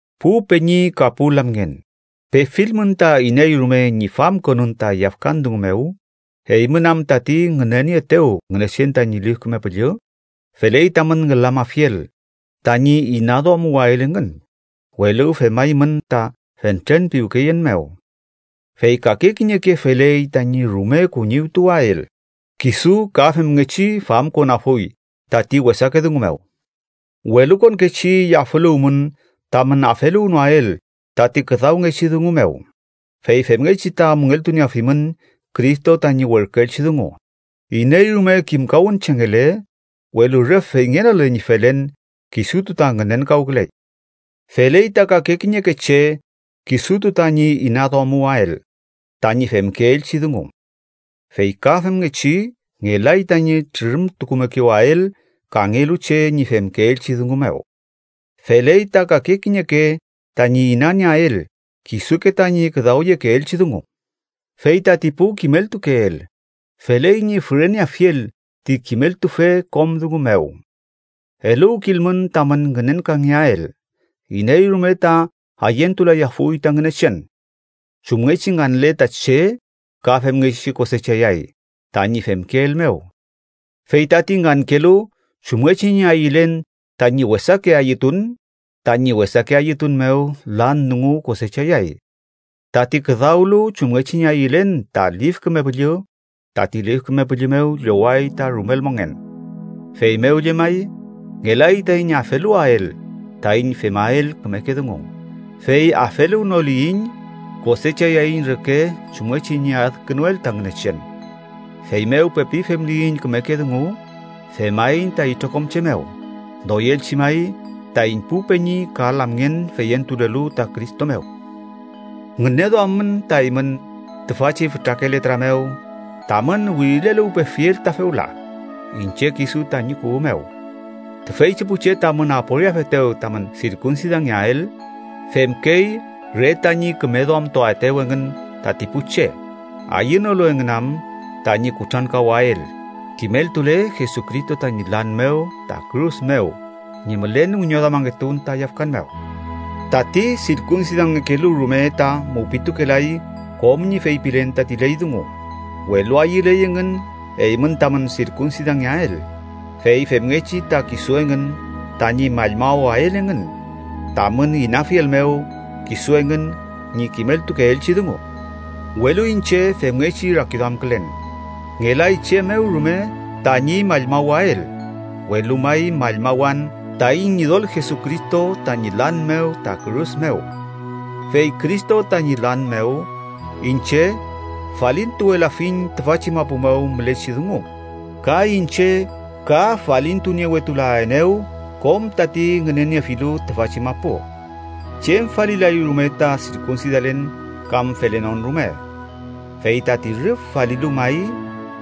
Pu peñi ka pu lamngen, pefilmün ta iney rume ñi famkonün ta yafkan dungu mew, eymün am tati ngünenieetew Ngünechen tañi Lif Küme Püllü, feley tamün ngülamafiel tañi inaduamuwael engün, welu femaymün ta fentren piwkeyen mew. Fey kake kiñeke feley tañi rume kuñiwtuael, kisu ka femngechi famkonafuy tati wesake dungu mew. Welukonkechi yafüluwmün tamün afeluwnoael tati küdawngechi dungu mew, fey femngechi ta müngeltunieafimün Cristo tañi werküelchi dungu. Iney rume kimkawünchengele, welu rüf feyngenole ñi felen, kisutu ta ngünenkawküley. Feley ta kake kiñeke che kisutu tañi inaduamuwael tañi femkeelchi dungu. Fey ka femngechi ngelay tañi trürümtukumekewael kangelu che ñi femkeelchi dungu mew. Feley ta kake kiñeke tañi inanieael kisuke tañi küdawyekeelchi dungu. Fey tati pu kimeltukeel, feley ñi füreneafiel ti kimeltufe kom dungu mew. Eluwkilmün tamün ngünenkangeael: iney rume ta ayentulayafuy ta Ngünechen. Chumngechi nganle ta che ka femngechi kosechayay tañi femkeel mew. Fey tati ngankelu chumngechi ñi ayülen tañi wesake ayütun, tañi wesake ayütun mew lan dungu kosechayay. Tati küdawlu chumngechi ñi ayülen ta Lif Küme Püllü, tati Lif Küme Püllü mew lloway ta rumel mongen. Feymew llemay, ngelay taiñ afeluwael taiñ femael kümeke dungu, fey afeluwnoliyiñ, kosechayaiñ reke chumngechi ñi adkünuel ta Ngünechen. Feymew pepi femliyiñ kümeke dungu, femaiñ ta itrokom che mew, doyelchi may taiñ pu peñi ka lamngen feyentulelu ta Cristo mew. ¡Ngüneduammün ta eymün tüfachi fütrake letra mew tamün wirileluwpefiel ta fewla, iñche kisu tañi kuwü mew! Tüfeychi pu che tamün aporiafetew tamün sirkunsidangeael, femkey re tañi küme duamtuaetew engün tati pu che, ayünolu engün am tañi kutrankawael, kimeltule Jesucristo tañi lan mew ta kürus mew ñi mülen wiñoduamangetun ta yafkan mew. Tati sirkunsidangekelu rume ta mupitukelay kom ñi feypilen tati ley dungu, welu ayüley engün eymün tamün sirkunsidangeael, fey femngechi ta kisu engün tañi mallmawael engün tamün inafiel mew kisu engün ñi kimeltukeelchi dungu. Welu iñche femngechi rakiduamkülen: ngelay chem mew rume tañi mallmawael, welu may mallmawan taiñ Ñidol Jesucristo tañi lan mew ta kürus mew. Fey Cristo tañi lan mew, iñche falintuwelafiñ tüfachi mapu mew mülechi dungu, ka iñche ka falintuniewetulaenew kom tati ngüneniefilu tüfachi mapu. Chem falilay rume ta sirkunsidalen kam felenon rume. Fey tati rüf falilu may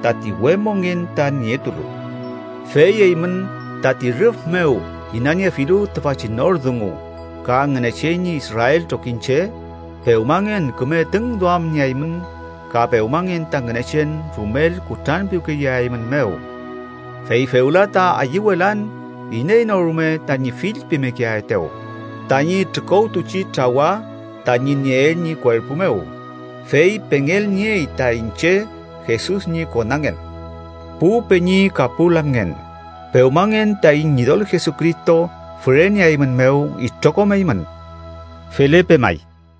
tati we mongen ta nietulu. Fey eymün tati rüf mew inaniefilu tüfachi nor dungu ka Ngünechen ñi Israel trokiñche, pewmangen küme tüngduamnieaymün ka pewmangen ta Ngünechen rumel kutranpiwkeyeaeymünmew. Fey fewla ta ayüwelan iney no rume tañi fillpimekeaetew, tañi trükowtuchi trawa tañi nieel ñi kuerpu mew, fey pengelniey ta iñche Jesus ñi konangen. Pu peñi ka pu lamngen, pewmangen taiñ Ñidol Jesucristo füreneaeymünmew itrokom eymün. Felepe may.